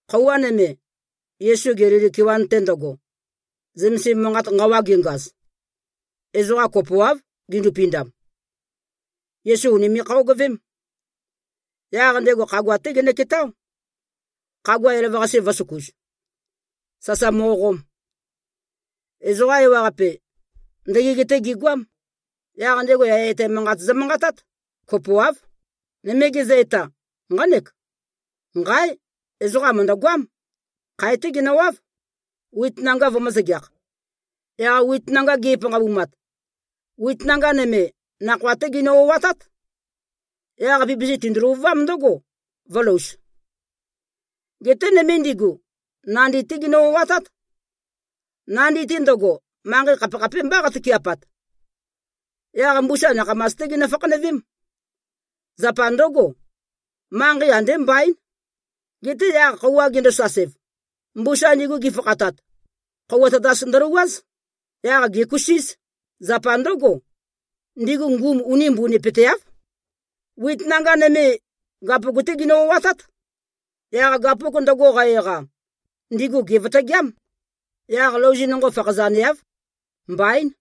Khøuwa nøme, Yesu Gelili kewan-te ndøgo, zømesim manqat nqawa gengaz, ezoqa kopoáv gindupindam. Yesu ùnime꞉-khøogøvém. Yaq ndego khagua-té genøketáo, khagua elavøqase vø̄søkuz, sasa mo꞉qom. Ezoqa ewaqape, ndøgeg-té gigoám. Yaq ndego yaya etæ manqat zømanqatát. Kopoáv. Nøme gezø-eta, nqánek, “Nqáe! Ezoqam mø̀ndøgoám. Khae-té genøwáv, wit nanga vømø̄-zøgeakh. Yaq wit nanga ge꞉panqabumat, nøme nakhoa-té ginø-o꞉atát. Yaq pipisi tindu-løvuvám ndǿgo, vø̄louz. Geté nøme ndigu, nandi-té ginø-o꞉atát. Nandi-te ndøgo, manqei khapekhapémbá qatøke꞉pat. Yaq mbusa nakhamas-té ginø-fakhanøvém. Zapa ndǿgo, manqei andé mbaín. Geté yaq, khøuwa gendosasev, mbusa ndigu gifakhatat, khøuwa tatas ndølouwáz. Yaq gèkusíz. Zapa ndǿgo, ndigu ngum uni mbunipøteáv. Wit nanga nøme, gapuk-té ginø-o꞉atát. Yaq gapuk ndøgo qa-eqa, ndigu gèvøtøgeám. Yaq louzi nonqo fakhazaneáv. Mbaín.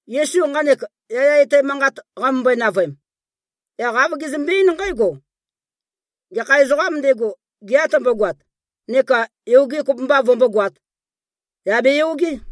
Yesu nqanek yaya etæ manqat qamømbøe-navøem, yaq āv gezømbe-eín nqǽgo, “Gekha ezoqām ndego, gea tømbogoat neka yoge kopømba vømbógoāt, yà beyogé!”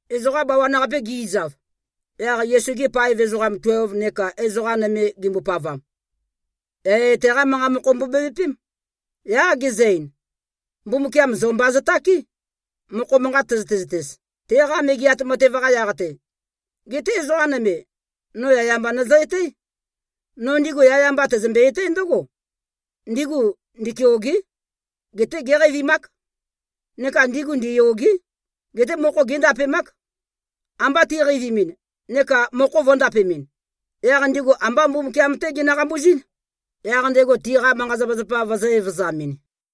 Ezoqa bawan-qape gi꞉zav, yaq Yesu-gi paev ezoqam tuelv neka ezoqa nøme gimbopavam, yaya etæ-qá manqa mokho mbobevøpém. Yaq gezø-ein, “Mbumbukiam zo mba zøtáke, mokho manqat tøzøte-zøtez, teqa Megeat Matev-qa yaq-te. Geté ezoqa nøme, no yaya mba nøzø-etǽ. No ndigu yaya mba tæzømbe-etǽ ndǿgo: Ndigu ndikeôgé. Geté géqeivimák. Neka ndigu ndiyôgé. Geté mokho géndapemák. Amba tiqeivimin neka mokho vø̄ndapemɨn, yaq ndigu ambá Mbumbukiam-té ginø-qambuzín, yaq ndego tiqa manqa-zapazapa vøzø̄-evøzamɨn.”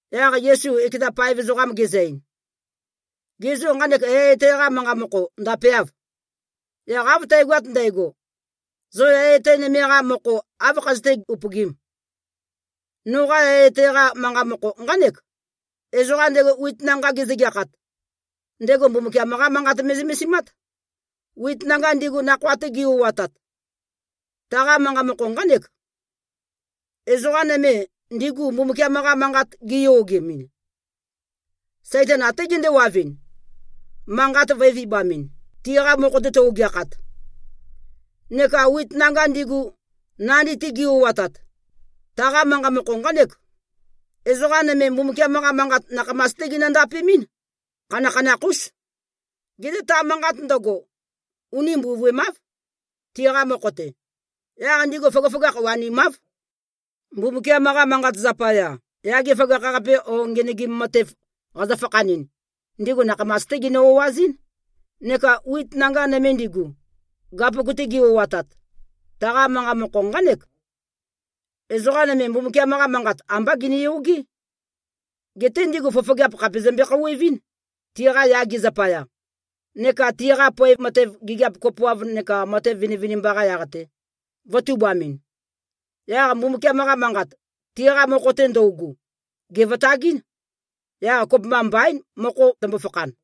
Yaq Yesu ekeza paev ezoqam gezø-ein, “Gê, zo nqanek yaya etæ-qa manqa mokho ndapeâv? Yaq av tægoat ndægo, zo yaya etæ nøme-qa mokho áv khazøté-upøgīm? Noqa yaya etæ-qa manqa mokho nqánek: Ezoqam ndego wit nanga gezøgeakhat, ndego Mbumbukiam-qá Manqat me꞉zømesimát. Wit nanga ndigu, nakhoa-te gi-o꞉atat, taqa manqa mokho nqánek: Ezoqa nøme, ndigu Mbumbukiam-qa Manqat giyogemɨn, Saitan até gendewavɨn, manqat vø̄e-vibamɨn, tiqa mokho-te tøu-ogeakhat. Neka wit nanga ndigu, nandi-te gi-o꞉atat, taqa manqa mokho nqánek: Ezoqa nøme, Mbumbukiam-qa Manqat nakhamas-té ginø-ndapemɨ́n. Khanakhanakh-ús. Geté ta manqat ndøgo, uni mbuvøemáv, tiqa mokho-te. Yaq ndigu føgøføgakh wanimáv. Mbumbukiam-qa Manqat zapaya, yage føgakh-qape o ngenøgim matev qazø-fakhanɨn, ndigu nakhamas-té ginø-o꞉azɨ́n. Neka wit nanga nøme ndigu, gapuk-te gi-o꞉atat, taqa manqa mokho nqánek: Ezoqa nøme, Mbumbukiam-qa Manqat ambá giniyogé. Geté ndigu fofogeap khàpe zømbe-khouwevɨ́n, tiqa yage zapaya, neka tiqa poev matev, gigiap kopoav neka matev vinivinimba-qa yaq-te, vø̄tubamɨn. Yaq Mbumbukiam-qa Manqat, tiqa mokho-te ndøugu, gèvøtagɨ́n. Yaq kopømba mbaín, mokho tømbo-fakhan.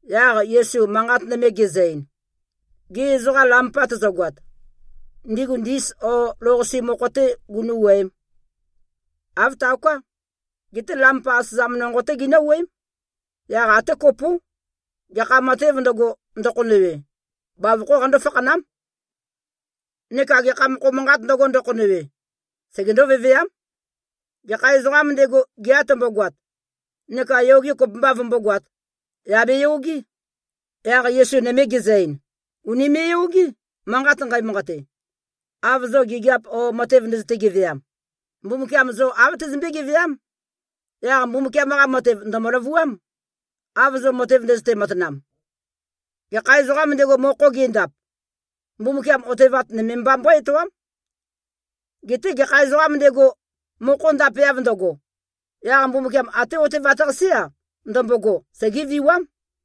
Yaq Yesu manqat nøme gezø-ein, “Gê, ezoqa lampa tøzøgoat, ndigu ndis o lou-qase mokho-té gunú꞉-wuøēm? Āv taoká! Geté lampa asøzam nonqo-té ginǿ-wuøém. Yaq até kopó. Gekha matēv ndøgo, ndøkhonøwe, bavokhó qandó-fakhanám. Neka gekha mokho manqāt ndøgo, ndøkhonøwe, segendó-veveám. Gekha ezoqām ndego, gea tømbogoat neka yoge kopømba vømbógoāt, yà beyogé!” Yaq Yesu nøme gezø-ein, “Ùnime꞉-yogé, manqat nqæmanqate. Av zo gigiap o matev ndøzøte-geveam, Mbumbukiam zo āv tezømbé-geveám. Yaq Mbumbukiam-qa matev ndø̀mø-løvuám, av zo matev ndøzøte-matanam. Gekha ezoqām ndego, mokho gendap, Mbumbukiam otevat nøme mba mbøé-etoám. Geté gekha ezoqām ndego, mokho ndapeav ndøgo, yaq Mbumbukiam até otevat-qasé-a, ndømbogo, segéviwám.”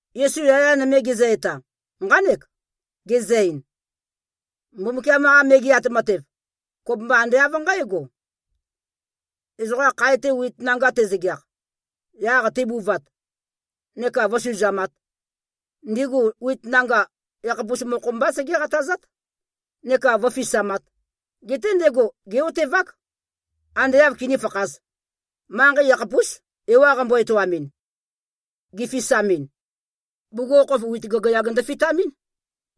Yesu yaya nøme gezø-eta, nqánek. Gezø-ein, “Mbumbukiam-qa Megeat Matev, kopømba ande av nqǽgo: Ezoqa khae-te wit nanga tezøgeakh, yaq tebuvat, neka vǿsuzamāt, ndigu wit nanga yakhapus mokho-mbá segé-qatazát neka vǿfisamāt. Geté ndego gé꞉-otevák, ande āv kinífakhāz. Manqei yakhapús, ewa qambo-etoamin, gifisamin. Bugukhokhof wit gagayag ndøfitamɨ́n,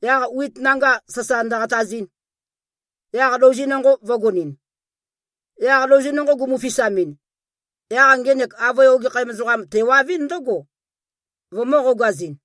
yaq wit nanga sasa ndøqatazɨn, yaq louzi nonqo vø̄gonɨn. Yaq louzi nonqo gumu-fisamɨn, yaq ngenek avøe ogekhæm ezoqam tewavɨ́n ndǿgo, vømø̄-qogazɨn.”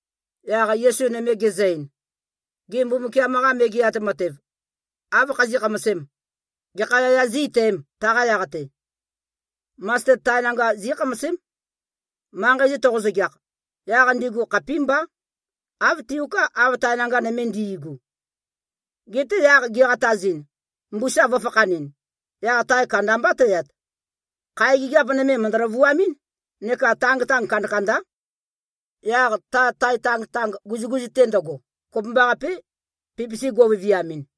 Yaq Yesu nøme gezø-ein, “Gê, Mbumbukiam-qa Megeat Matev, áv khazí꞉-khamasēm? Gekha yaya zí-etæēm, taqa yaq-te? Masted tae nanga zí꞉khamasém. Manqei-te toqo-zøgeakh, yaq ndigu khapímbá. Āv tiuká, av tae nanga nøme ndi꞉gu. Geté yaq giqatazin, mbusa vø̄fakhanɨn, yaq tae kandambá tøyat. Khae gigiap nøme mø̀ndø-løvuamɨ́n, neka tangtang kandakandá. Yaq ta tae tangtang guzuguzu-te ndøgo, kopømbaqapé, pipisi go꞉viviamɨn.”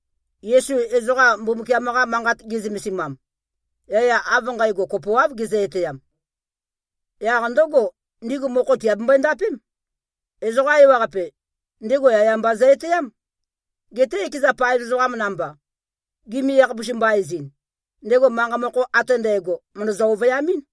Yesu ezoqa Mbumbukiam-qa Manqat ge꞉zømesimam, yaya av nqægo kopoáv gezø-etæam. Yaq ndǿgo, ndigu mokho tìabembøe-ndapém. Ezoqa ewaqape, ndego yaya mba zø-etæám. Geté ekeza paev ezoqam namba, gimi-yakhapus-mba-ezɨn, ndego manqa mokho ate ndægo mø̀ndøzø-ovøyamɨ́n.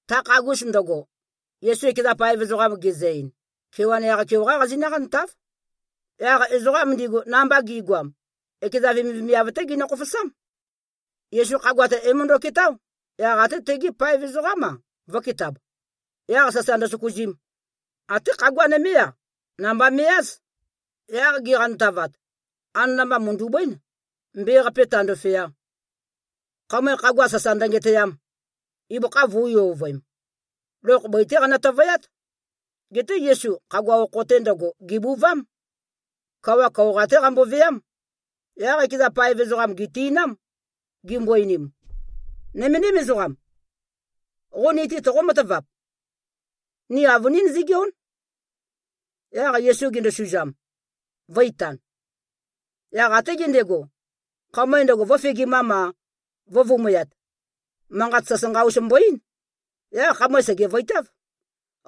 Ta khagus ndøgo, Yesu ekeza paev ezoqam gezø-ein, “Kewan yaq-keoqá qazinǿ-qantáv.” Yaq ezoqam ndigu, namba gi꞉goam, ekeza vemivemiav-té ginø-khofosám. Yesu khagua-te é-møndøketáo, yaq até tegi paev ezoqám-a, vø̄ketab, yaq sasa ndøsøkuzim. Até khagua nømé-a, namba me꞉-áz. Yaq giqantavat, anana-mba mø̀ndu꞉bǿen, mbe-qape tāndōfeā, khamøe khagua sasa ndøngetøyam, ibøkha vø̄u-yovøem. Lokh bøi-té qanø-tøvøyát. Geté Yesu khagua okho-te ndøgo, gèbuvám. Kawa kaoqa-té qamboveám. Yaq ekeza paev ezoqam gèti꞉nám, gimbo-einim, “Nøméndim ezoqam! Qo ni-te toqó-matavap? Ni avønín zígeón!” Yaq Yesu gendosuzam, vø̄-itan. Yaq até gendego, khamøe ndøgo, vø̄fegimam-a, vø̄vumøyat, manqat sasanqa-us mbo-eín. Yaq khamøe sègevøitáv.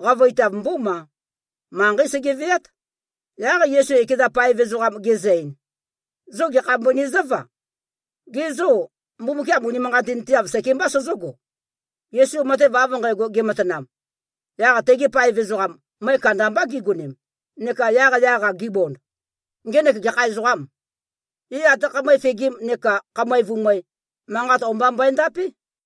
Qavøitav mbómā. Manqeí sege꞉veát. Yaq Yesu ekeza paev ezoqam gezø-ein, “Zo, gekha mbøni zǿva? Ge zô, Mbumbukiam unimanqatinteav sekembā sozógo?” Yesu matev av nqægo gematanam, yaq tegi paev ezoqam, møe kandambá gigonem, neka yaqyaq-a gibond, “Ngenek gekha ezoqâm? É, até khamøe fegim neka khamøe vumøe, manqat o-mba mbøendapé.”